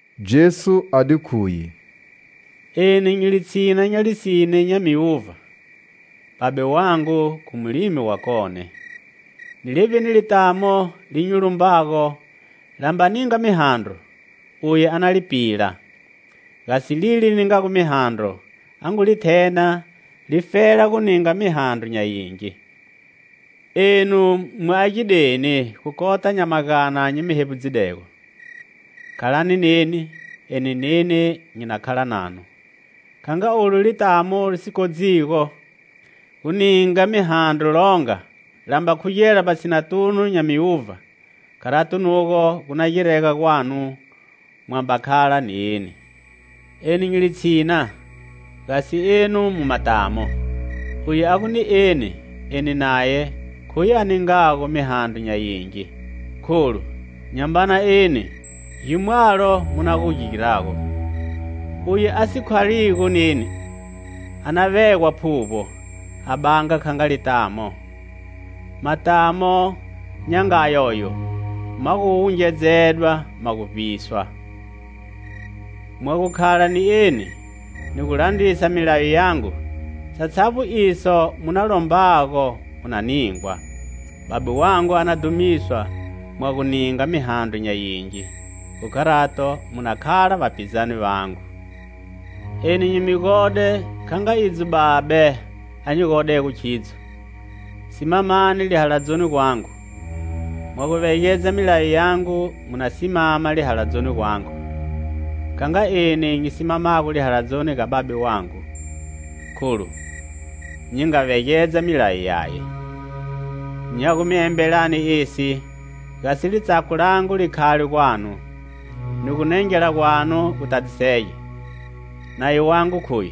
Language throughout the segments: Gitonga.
Jesu a di khuye: "Eni nyi litshina nya lisine nya miuvha, Babe wangu khu mulimi wakone. Ni levbini litamo li nyi lumbago, la mba ninga mihandro, uye a na li pila; gasi lile li ningago mihandro, a ngu li thena, li fela gu ninga mihandro nya yingi. Enu mu agideni khu kota nya magana nyi mi hevbudzidego. Khalani neni, eni neni nyi na khala nanu. Kha nga olu litamo li si kodzigo gu ninga mihandro longa, la mba khugela vbatshinatunu nya miuvha, kharato nugo gu na girega gwanu, mwa mba khala ni eni. "Eni nyi litshina, gasi enu mu matamo; uye a gu ni eni, eni naye, khuye a ningago mihandro nya yingi; kholu nyamba na eni gimwalo mu na gu girago. Uye a si khaligo neni, a na vegwa phuvbo, a banga kha nga litamo; matamo nya nga a yoyo ma gu wungedzedwa ma gu vbiswa. Mwa gu khala ni eni, ni gulandrisa milayo yangu, satshavbo iso mu na lombago mu na ningwa. Babe wangu a na dhumiswa mwa gu ninga mihandro nya yingi; khu kharato, mu na khala vapizane vangu. "Eni nyi mi gode, kha nga idzo Babe a nyi godego khidzo; simamani lihaladzoni gwangu. Mwa gu vegedza milayo yangu, mu na simama lihaladzoni gwangu, kha nga eni nyi simamago lihaladzoni ga Babe wangu, kholu nyi nga vegedza milayo yaye. "Nya gu mi embela esi, gasi litsako langu li khale gwanu, ni gu gunengela gwanu gutadzisege. Nayo wangu khoyu: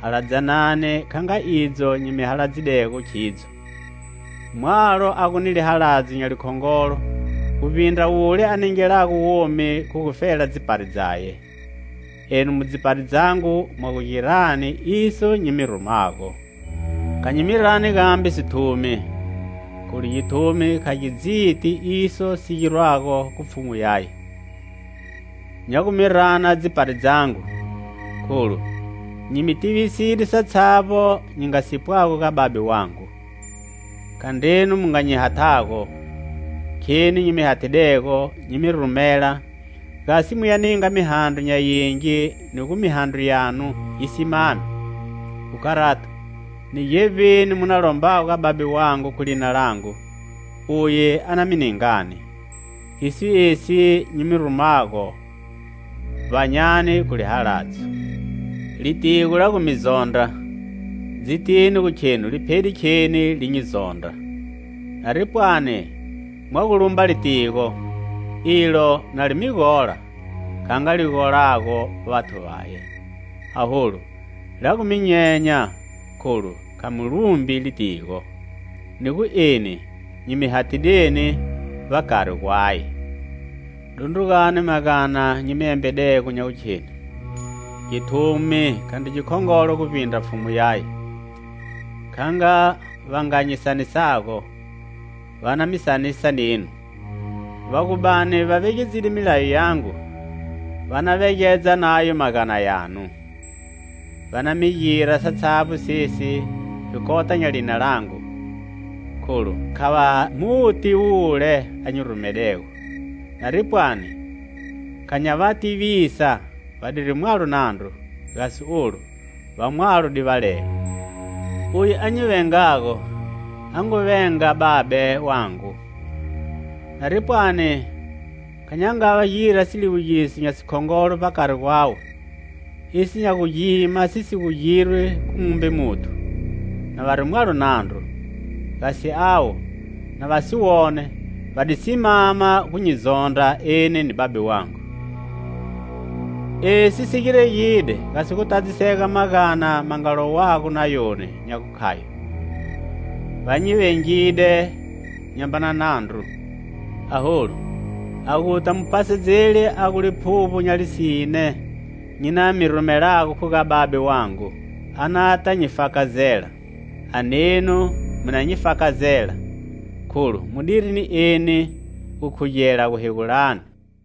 Haladzanani kha nga idzo nyi mi haladzidego khidzo. Mwalo a gu ni lihaladzo nya likhongolo guvbindra wule a ningelago womi khu gufela dzipari dzaye. Enu mu dzipari dzangu mwa gu girani iso nyi mi rumago. Kha nyi mi rani gambe sithumi, kholu githumi kha gi dziti iso si girwago khu pfhumu yaye; nya gu mi rana dzipari dzangu, kholu nyi mi tiviside satshavbo nyi nga si pwago ga Babe wangu. Khandrenu mu nga nyi hathago, kheni nyi mi hathidego nyi mi rumela, gasi muya ninga mihandro nya yingi ni gu mihandro yanu yi simame. Khu kharato, ni gevbini mu na lombago ga Babe wangu khu lina langu, uye a na mi ningani Khiso esi nyi mi rumago: Vbanyani khu lihaladzo. "Litigo la gu mi zondra, dzitini gu khenu liphede kheni li nyi zondra. Nari pwani mwa gu lumba litigo, ilo na li mi gola, kha nga li golago vathu vaye; aholu, la gu mi nyenya, kholu kha mu lumbi litigo, ni gu eni nyi mi hathideni vbakari gwaye. Dundrugani magana nyi mi embedego, nya gukheni: githumi khandri gikhongolo guvbindra pfhumu yaye. Kha nga va nga nyi sanisago, va na mi sanisa nenu; va gu bani va vegedzide milayo yangu, va na vegedza nayo magana yanu. Va na mi gira satshavbo sesi, khu kota nya lina langu, kholu kha va mu ti wule a nyi rumedego. Nari pwani kha nya va tivisa, vadiri mwalo nandru; gasi olu va mwalo divalelo. Uye a nyi vengago, a ngu venga Babe wangu. Nari pwani kha nya nga gira siliwugiso nya sikhongolo vbakari gwawe, iso nya gu gima si si gu girwi khu mumbe muthu, na vari mwalo nandru; gasi avo, na va si wone, va di simama gu nyi zondra eni ni Babe wangu. Esi si giregide gasi gu tadzisega magana ma nga lowago Nayoni, nya gu khayo: 'Va nyi vengide nyamba na nandru.' "Aholu, a guta Muphasedzeli, a gu Liphuvbo nya lisine nyi na mi rumelago khu ga Babe wangu, a nata nyi fakazela. A nenu mu na nyi fakazela, kholu mudiri ni eni gukhugela guhegulani.